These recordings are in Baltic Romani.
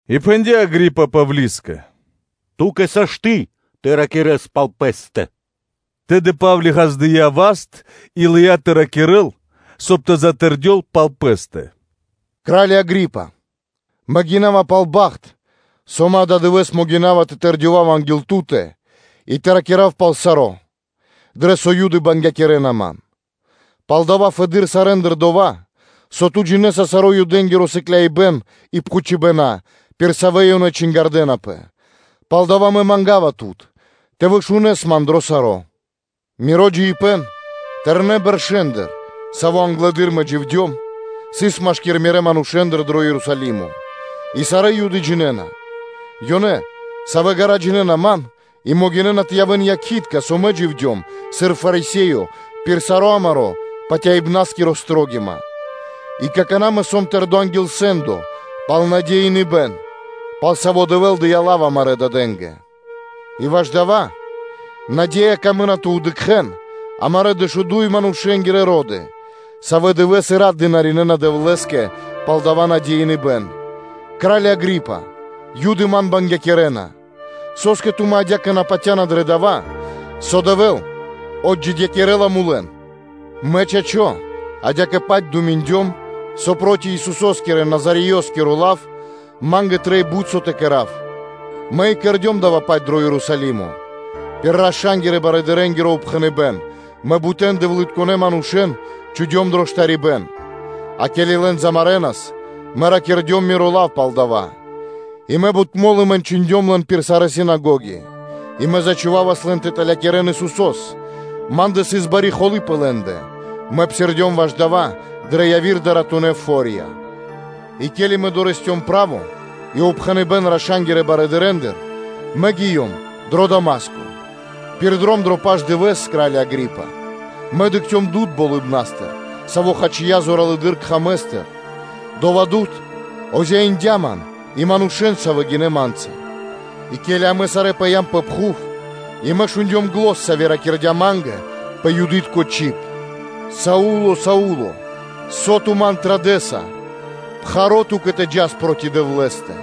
И пхэндя́ Агри́па Павлискэ: “Ту́кэ сашты́ тэ ракирэ́с пал пэ́стэ.” Тэды Па́вли ґаздыя́ васт и лыя́ тэ ракирэ́л, соб (кай) тэ затэрдёл пал пэ́стэ: “Кра́лё Агри́па! Мэ гинава пал бахт, со мэ ададывэ́с могина́ва тэ тэрдёвав анги́л ту́тэ и тэ ракира́в пал саро́, дрэ со Юды бангякирэна ман, палдава́ фэды́р сарэ́ндыр дова́, со ту джинэ́са саро́ Юдэ́нгиро сыкляибэн и пхучыбэна, пир савэ́ ёнэ чингардэнапэ; палдава́ Мэ манга́ва тут тэ вышунэс ман дро саро́. Миро джиибэ́н тэрнэ́ бэршэ́ндыр, саво́ англэды́р мэ дживдём, сыс машки́р мирэ́ манушэ́ндэ дро Ерусалимо, и сарэ́ Юды джинэ́на; ёнэ, савэ́ ґара́ джинэ́на ман, и могинэ́на тэ явэ́н якхи́тка, со мэ дживдём, сыр Фарисеё пир сари́ амари́ патяибнаскири строгима. И какана́ мэ сом тэрдо́ анги́л сэ́ндо пал лачхо́ ужакирибэ́н (надеиныбэн), пал саво́ Дэвэ́л дыя́ лав амарэ́ дадэ́нгэ, и ваш дая́ наде́я, амарэ́ дэшуду́й манушэ́нгирэ ро́ды, дывэ́с и рат дынаринэна Дэвлэ́скэ, и пал дая́ наде́я, кра́лё Агри́па, Юды ман бангякирэна. Со́скэ тумэ́ адя́кэ на патя́на дро дава́, со Дэвэ́л отджидякирэла мулэн? Мэ, чачо́, адя́кэ-паць думиндём, со проти Исусо́скирэ Назареёскиро лав ма́нгэ трэй бут со тэ кэра́в. Мэ и кэрдём дава́-паць дро Ерусалимо; пир раша́нгирэ – барыдырэнгиро упхэныбэ́н, мэ бутэн дэвлытконэ́ манушэ́н чхудём дро штарибэ́н; а ке́ли лэн замарэнас, мэ ракирдём миро лав пал дава́. Мэ бут мо́лы мэнчындём лэн пир сарэ́ синагоги, и мэ зачхувавас лэн тэ тэлякирэн Исусо́с. Ма́ндэ сыс бари холы́ пэ лэ́ндэ, мэ псирдём ваш дава́ дрэ яви́р дуратунэ́ фо́рья. И ке́ли мэ дорэсцём (лыём) право и упхэныбэ́н раша́нгирэ барыдырэндыр, мэ гиём дро Дама́ско. Пир дром дро пашдывэс, кра́лё Агри́па, мэ дыкхцём дуд (свэ́то) болыбна́стыр, саво́ хачия зоралэды́р кхамэстыр, дова́ дуд озяиндя ман и манушэ́н, савэ́ гинэ́ ма́нца. И ке́ли амэ сарэ́ пыям пэ пхув, и мэ шундём зан, сави́ ракирдя́ ма́нгэ пэ Юды́тко чиб: “Са́вле, Са́вле! Со ту Ман традэса? Пхаро́ исын ту́кэ тэ джас проти Дэвлэ́стэ.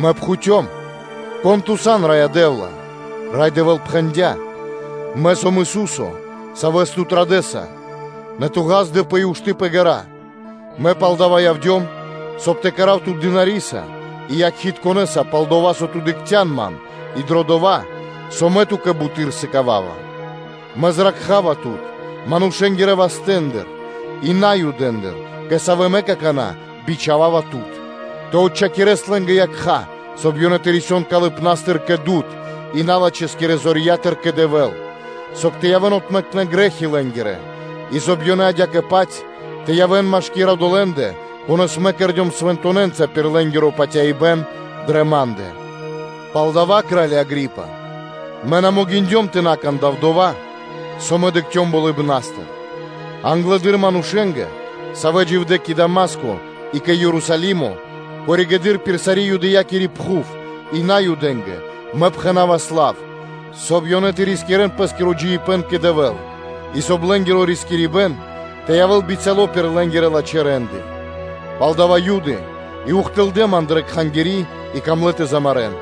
Мэ пхуцём: “Кон Ту сан, Раё Дэ́вла?” Рай Дэвэ́л пхэндя́: “Мэ сом Ису́со, Савэс ту традэса: нэ ту ґаздэпэ и ушты́ пэ ґэра́, Мэ палдава́ явдём, соб (кай) тэ кэра́в тут дынариса и якхитконэса долэ́скэ, со ту дыкхця́н Ман, и дро дова́, со Мэ ту́кэ буты́р сыкава́ва, Мэ зракха́ва тут – манушэ́нгирэ вастэ́ндыр и Наюдэндыр, кэ савэ́ Мэ какана́ бичхава́ва тут, тэ отчхакирэс лэ́нгирэ якха́, соб (кай) ёнэ тэ рисён калыпна́стыр кэ дуд и налачхэскирэ зорья́тыр кэ Дэвэ́л, соб (кай) тэ явэ́н отмэкнэ грэ́хи лэ́нгирэ, и соб (кай) ёнэ адя́кэ-паць тэ явэ́н машки́р одолэ́ндэ, конэ́с Мэ кэрдём свэнтонэнца пир лэ́нгиро патяибэ́н дрэ Ма́ндэ.” Палдава́, кра́лё Агри́па, мэ на могиндём тэ на кандав дова́, со мэ дыкхцём болыбна́стыр; а англэды́р манушэ́нгэ, савэ́ дживдэ́ кэ Дама́ско и кэ Ерусалимо, коригэды́р пир сари́ Юдэякири пхув и Наюдэ́нгэ мэ пхэнавас лав, соб (кай) ёнэ тэ рискирэ́н пэ́скиро джиибэ́н кэ Дэвэ́л и, соб (кай) лэ́нгиро рискирибэн тэ явэ́л мол пир лэ́нгирэ лачхэ́ рэ́нды. Пал дава́ Юды и ухтылдэ́ ман дрэ Кхангири́ и камлэ́ тэ замарэ́н.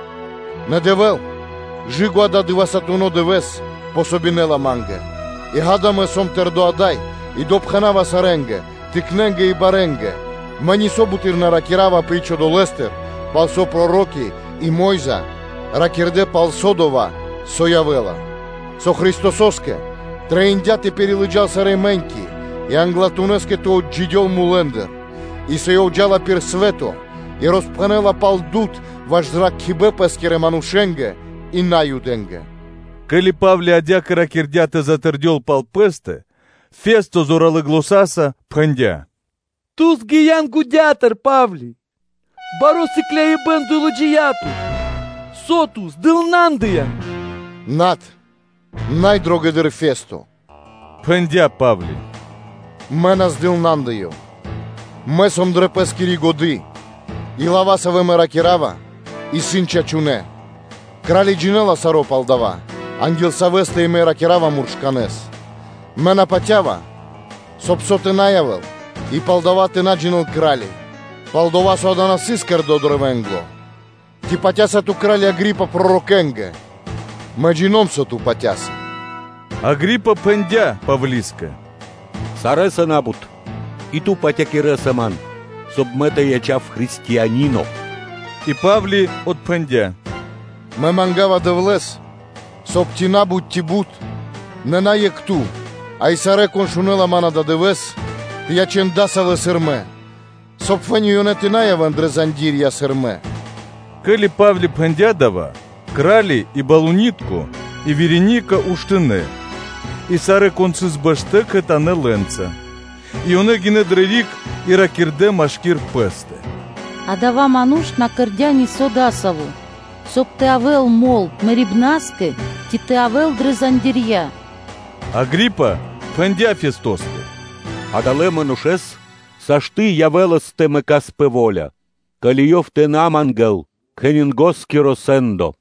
Нэ Дэвэ́л кэ/жы́ко ададывэсатуно дывэ́с помогинэла ма́нгэ, и, ґа́да, мэ сом тэрдо́ ада́й и допхэнава сарэ́нгэ, тыкнэнгэ и барэнгэ, мэ нисо́ буты́р на ракира́ва, апри́ч дова́, пал со проро́ки и Мо́йза ракирдэ́ пал дова́, со явэ́ла, со Христосо́скэ трэиндя́ тэ пирилыджал сарэ́ мэ́ньки и англатунэскэ тэ отджидёл мулэ́ндыр, и со Ёв джа́ла пир свэ́то и роспхэнэ́ла пал дуд ваш зракхибэ́н Пэ́скирэ манушэ́нгэ и Наюдэ́нгэ.” Ке́ли Па́вле адя́кэ ракирдя́ тэ затэрдёл пал пэ́стэ, о Фесто зоралэ́ заня́са пхэндя́: “Ту згиян годятыр, Па́вли! Баро́ сыкляибэн долыджия тут, со ту здылнандыян.” “Над, Най Дрогэдыр Фесто, – пхэндя́ Па́вли, – мэ на здылнандыём, мэ сом дрэ пэ́скири годы́ и лава́, савэ́ мэ ракира́ва, исын чачунэ́. Кра́ли джинэ́ла саро́ пал дава́, анги́л савэ́стэ и мэ ракира́ва муршканэ́с. Мэ на патя́ва, соб (кай) со тэ на явэ́л и пал дава́ тэ на джинэ́л кра́ли; пал-дова́ со дава́ на сыс кэрдо́ дро вэнгло. Ци патя́са ту, кра́лё Агри́па, пророкэнгэ? Мэ джино́м (джина́в), со ту патя́са.” Агри́па пхэндя́ Павлискэ: “Сарэ́са на́бут, и ту патякирэса ман, соб (кай) мэ тэ ячав християниноса.” И Па́вли отпхэндя́: “Мэ манга́ва Дэвлэ́с, соб (кай) ци на́бут, ци бут, нэ на екх ту, а сарэ́, кон шунэ́ла ман ададывэ́с, тэ ячэн дасавэ́, сыр мэ сом, соб (кай) фэ́ни ёнэ тэ на явэ́н дрэ зандирья́ (цэ́пи), сыр мэ.” Ке́ли Па́вли пхэндя́ дава́, кра́ли и балунитко и Вереника уштынэ́, и сарэ́, кон сыс бэштэ́, кхэтанэ́ лэ́нца, и ёнэ гинэ́ дрэ риг, и ракирдэ́ машки́р пэ́стэ: “Адава́ ману́ш на кэрдя́ нисо́ дасаво, соб (кай) тэ явэ́л мол мэрибна́скэ ци тэ явэ́л дрэ зандирья́ (цэ́пи).” Агри́па пхэндя́ Фестоскэ: “Адалэ́ манушэ́с сашты́ (можна) явэ́лас тэ мэкас пэ во́ля, ко́ли ёв тэ на мангэ́л кхенингоскиро сэ́ндо.”